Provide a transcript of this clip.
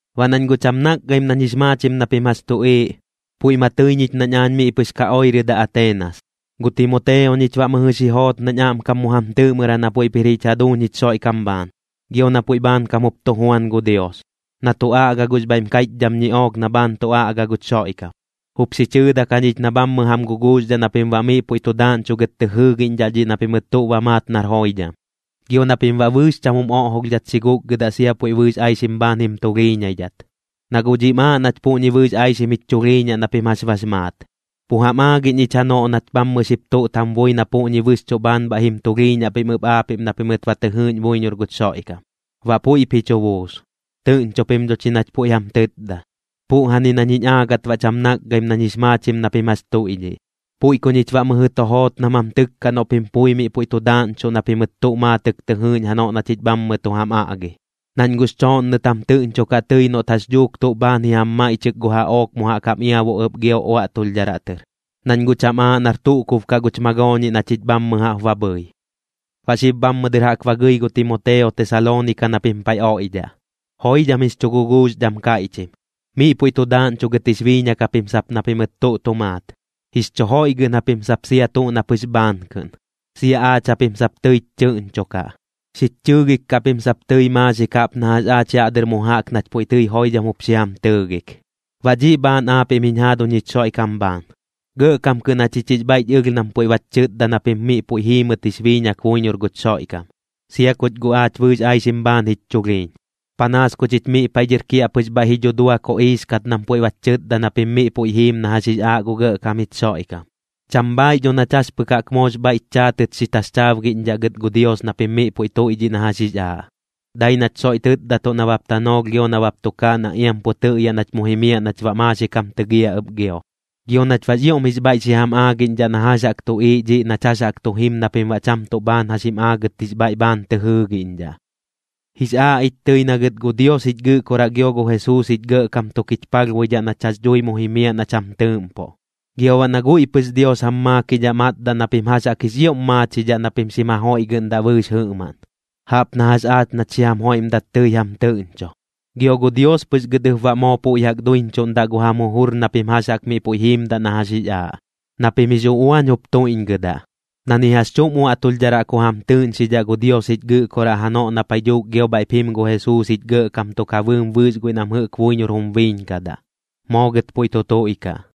Baꞌ nañ guꞌ cham nakgaim nañ jix maachim na pim jax tuꞌiiꞌ, puiꞌ ma tɨi ñich nañ aañ miꞌ pɨx ka oirɨdaꞌ Ateenas, gu Timoteo ñich baꞌ mɨjɨ xi joot nañ aꞌmkam mu jam tɨɨꞌmɨraꞌ na puiꞌp jir jich jaduuñ jich Xoiꞌkam bhaan, gio na puiꞌ bhaankam jup tu juan gu Dios, na tu aꞌga gux bhaiꞌm kaiꞌchdham ñiꞌook na bhaan tu aꞌga guch Xoiꞌkam. Jup xi chɨɨdak jañich na bhammɨ jam guguuxdhaꞌ na pim baꞌ miꞌ puiꞌ tu daaꞌñchugɨt tɨ jɨɨgiꞌñdhaꞌ dhiꞌ na pimɨt tuꞌ ba maat nar joidham. Gio na pim baꞌ bɨɨx cham jum oꞌjolhdhat xi gukgɨdaꞌ sia puiꞌ bɨɨx aixim bhaan jim tulhiiñaidhat, na guꞌ dhiꞌm aaꞌ nach puꞌñi bɨɨx aixim jich chulhiiñaꞌ na pim jax bax maat. Pu jam aagiꞌñ ich janoꞌ nach bhammɨ xip tuꞌt jam bui na puꞌñi bɨxchuꞌ bhaan bhaiꞌ jim tulhiiñaꞌ pim ɨp aapiꞌm na pimɨt ba tɨ jɨɨꞌñ buiñor guch Xoiꞌkam, baꞌ puiꞌp ji chu buus. Tɨꞌñcho pim dho chi nach puiꞌ jam tɨtda. Puꞌjani nañ jiñ aagɨt baꞌ cham nakgaim nañ jix maachim na pim jax tuiꞌdhiꞌ. Puiꞌ ku ñich baꞌ mɨjɨ tu joot nam jam tɨkkaꞌ noꞌ pim pui miꞌ puiꞌ tu daaꞌñchuꞌ na pimɨt tuꞌ maatɨk tɨ jɨɨꞌñ janoꞌ na chich bhammɨ tu jam aꞌgi. Nañ guꞌx chooꞌnnɨt jam tɨꞌñchokaꞌ tɨi noꞌt jax dhuuk tuꞌ bhaan ji jam maiꞌchɨk gu jaꞌook mu jaꞌk jam iabu ɨp gio uaꞌtulhdharaꞌ tɨr, nañ guꞌ cham aaꞌ nar tuꞌ kub kaꞌ guch magooñiꞌ na chich bhammɨ jaꞌp ba bhɨi. Baꞌ xib bhammɨ dɨr jaꞌk ba gɨi gu Timoteo Tesaloonika na pim paiꞌ oiꞌdhaꞌ, joidham jix chu guguuxdham kaiꞌchim. Miꞌ puiꞌ tu daaꞌñchugɨt jix biiñak japim sap na pimɨt tuꞌ tu maat, jix chu joiꞌgɨꞌn japim sap sia tuꞌ na pɨx bhaan kɨꞌn. Sia aach japim sap tɨich chɨꞌñchokaꞌ, xich chɨɨgik kaꞌ pim sap tɨi maaxik jaꞌp na jax aach yaꞌ dɨr mu jaꞌk nach puiꞌ tɨi joidham jup xi jam tɨɨgik. Baꞌ dhiꞌ bhaan aapiꞌm jiñ jaaduñ jich Xoiꞌkam bhaan, gɇꞌkam kɨꞌn jachich jix bhaiꞌch ɨlh nam puiꞌ bach chɨtda na pim miꞌ puiꞌ jiimɨt jix biiñak buiñor guch Xoiꞌkam, sia kuch guꞌ aach bɨɨx aixim bhaan jich chulhiiñ. Panaas ku chich miꞌ paiꞌ dhɨr kiaꞌpɨx bhaiꞌ ji dhudua koꞌiix kat nam puiꞌ bach chɨtda na pim miꞌ puiꞌ jiim na jax jix aaꞌ gu Gɇꞌkam jich Xoiꞌkam. Cham bhaaiꞌ dho nach jax pɨk jaꞌk moox bhaiꞌch chaatɨt xi taxchaabgiꞌñdhaꞌ gɨt gu Dios na pim miꞌ puiꞌ tuiꞌdhiꞌ na jax jix aaꞌ, dai nach soiꞌ tɨtdatuꞌ nabap tanoolh gio nabap tukaaꞌ na iam pu tɨꞌyaꞌ nach mu jimiaꞌ nach baꞌ maaxik jam tɨgiaꞌ ɨp gio, gio nach baꞌx ioꞌm jix bhaiꞌ xi jam aagiꞌñdhaꞌ na jax jaꞌk tu tuꞌiiꞌ dhiꞌ nach jax jaꞌk tu jim na pim baꞌ cham tuꞌ bhaan jax jim aagɨt jix bhaiꞌ bhaan tɨ jɨɨgiꞌñdhaꞌ. Jix aaꞌ ich tɨi na gɨt gu Dios jich Gɨꞌkoraꞌ gio gu Jesuus jich Gɇꞌkam tuk jich palhbuidhaꞌ nach jax dhui mu jimiaꞌ nach jam tɨɨꞌmpoꞌ. Gio baꞌ na guiꞌ pɨx Dios jam maakidhaꞌ matdaꞌ na pim jax jaꞌk jix ioꞌm maachidhaꞌ na pim xim jajoiꞌgɨꞌndaꞌ bɨɨx jɨꞌmaꞌn, jaꞌp na jax aach nach xi jam joiꞌmdat tɨi jam tɨꞌñcho. Gio gu Dios pɨx gɨt ɨp baꞌ moo puiꞌ jaꞌk duiñchuꞌndaꞌ gu jam jujur na pim jax jaꞌk miꞌ puiꞌ jiimdaꞌ na jax jix aaꞌ, na pim jix uꞌuañ jup tuiꞌñgɨdaꞌ, na ni jax chuꞌm uaꞌtulhdharaꞌ ku jam tɨɨꞌñxidhaꞌ gu Dios jich Gɨꞌkoraꞌ janoꞌ na paiꞌ dhuuk gio bhaiꞌp jim gu Jesuus jich Gɇꞌkam tuk ja bɨɨm bɨɨx guiꞌ nam jɨꞌk buiñor jum biiñkadaꞌ. Moo gɨt puiꞌ tu tuiꞌkaꞌ.